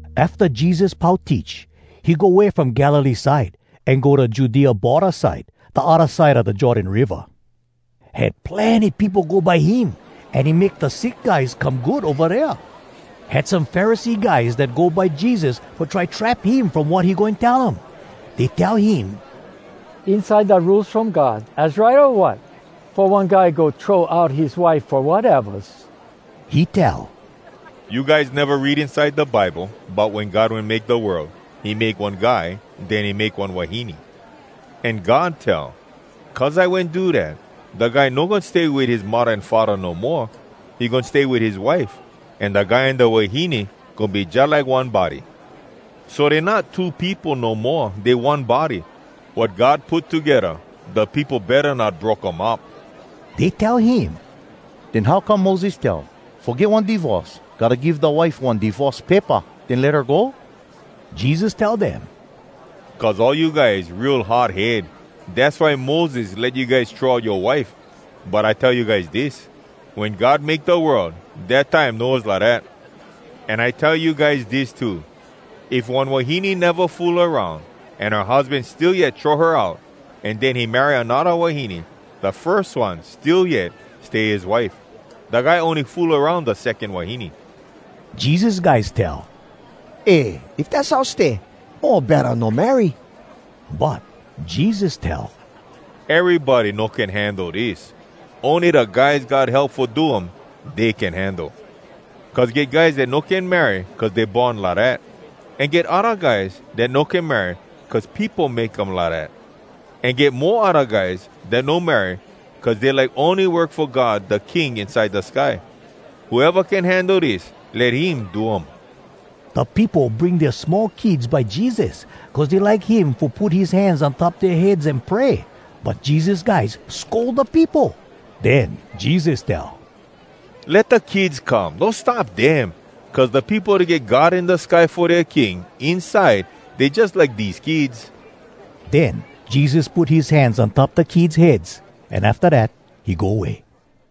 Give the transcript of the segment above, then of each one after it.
Afta Jesus pau teach, he go way from Galilee side, an go da Judea borda side, da odda side a da Jordan Riva. Had plenny peopo go by him, an he make da sick guys come good ova dea. Had some Pharisee guys dat go by Jesus fo try trap him from wat he goin tell um. Dey tell him, “Inside da Rules From God, az right, o wat, fo one guy go throw out his wife fo watevas?” He tell, “You guys neva read inside da Bible bout wen God wen make da world? He make one guy, den he make one wahine. An God tell, ‘Cuz I wen do dat, da guy no goin stay wit his muddah an faddah no moa, he goin stay wit his wife, an da guy an da wahine goin be jalike one body.’ So dey not two peopo no moa, dey one body. Wat God put togedda, da peopo betta not broke um up.” Dey tell him, “Den how come Moses tell, ‘Fo get one divorce, gotta give da wife one divorce paypa, den let her go’?” Jesus tell dem, “Cuz all you guys real hard head, dass why Moses let you guys throw out yoa wife. But I tell you guys dis: Wen God make da world, dat time no was lidat. An I tell you guys dis too: If one wahine neva fool aroun, an her husban still yet throw her out, an den he marry anodda wahine, da firs one still yet stay his wife. Da guy ony fool aroun da secon wahine.” Jesus guys tell, “Eh, if dass how stay, mo betta no marry.” But Jesus tell, “Erybody no can handle dis, ony da guys God help fo do um, dey can handle. Cuz get guys dat no can marry cuz dey born lidat. An get odda guys dat no can marry cuz peopo make um lidat. An get mo odda guys dat no marry cuz dey like ony work fo God, da King inside da sky. Whoeva can handle dis, let him do um.” Da peopo bring dea small kids by Jesus, cuz dey like him fo put his hands on top dea heads an pray. But Jesus guys scold da peopo. Den Jesus tell, “Let da kids come! No stop dem! Cuz da peopo dat get God in da sky fo dea King, inside dey jus like dese kids.” Den Jesus put his hands on top da kids heads, an afta dat, he go way.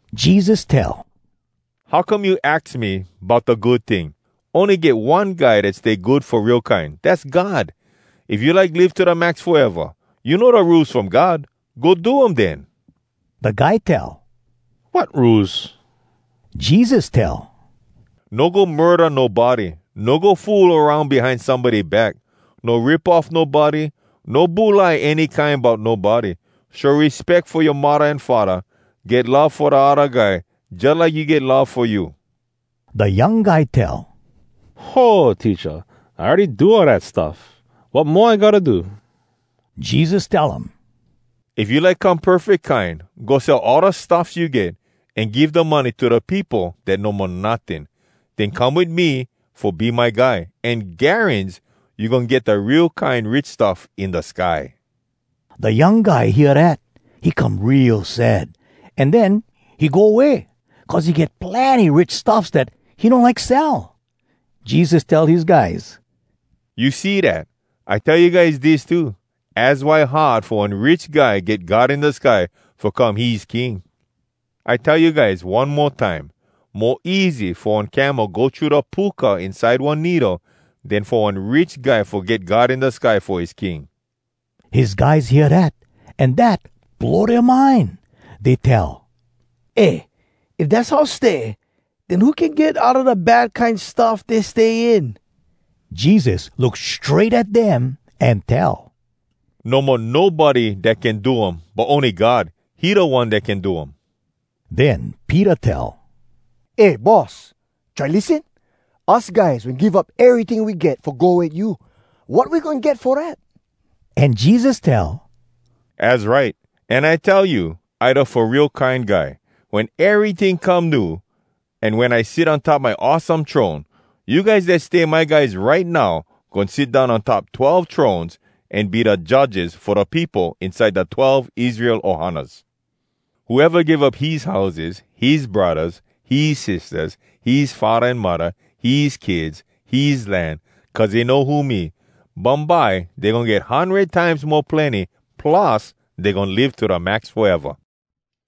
Jesus tell, “How come you aks me bout da ‘good ting’? Ony get one Guy dat stay good fo real kine, dass God! If you like live to da max foeva, you know da Rules From God? Go do um, den.” Da guy tell, “Wat rules?” Jesus tell, “No go murda nobody, no go fool aroun behind somebody back, no rip off nobody, no bulai any kine bout nobody, show respeck fo yoa muddah an faddah, get love fo da odda guy jalike you get love fo you.” Da young guy tell, “Ho, Teacha! I awready do all dat stuff. Wat mo I gotta do?” Jesus tell um, “If you like come perfeck kine, go sell all da stuffs you get, an give da money to da peopo dat no mo notting. Den come wit me fo be my guy. An garans you goin get da real kine rich stuff in da sky.” Da young guy hear dat, he come real sad, an den he go way, cuz he get plenny rich stuffs dat he no like sell. Jesus tell his guys, “You see dat? I tell you guys dis too, az why hard fo one rich guy get God in da sky fo come his King. I tell you guys one mo time, mo easy fo one camel go thru da puka inside one needle, den fo one rich guy fo get God in da sky fo his King.” His guys hear dat, an dat blow dea mind. Dey tell, “Eh, if dass how stay, den who can get outa da bad kine stuff dey stay in?” Jesus look strait at dem, an tell, “No mo nobody dat can do um, but ony God, he da One dat can do um.” Den Peter tell, “Eh, Boss, try lissen! Us guys wen give up eryting we get fo go wit you. Wat we goin get fo dat?” An Jesus tell, “Az right! An I tell you, I da Fo Real Kine Guy. Wen eryting come new, an wen I sit on top my awesome throne, you guys dat stay my guys right now, goin sit down on top twelve thrones an be da judges fo da peopo inside da twelve Israel ohanas. Whoeva give up his houses, his braddahs, his sistahs, his faddah an muddah, his kids, his land, cuz he know who me, bumbye dey goin get hundred times mo plenny, plus, dey goin live to da max foeva.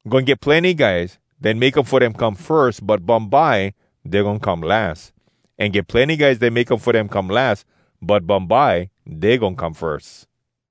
Goin get plenny guys dat make um fo dem come firs, but bumbye dey goin come las. An get plenny guys dat make um fo dem come las, but bumbye dey goin come firs.”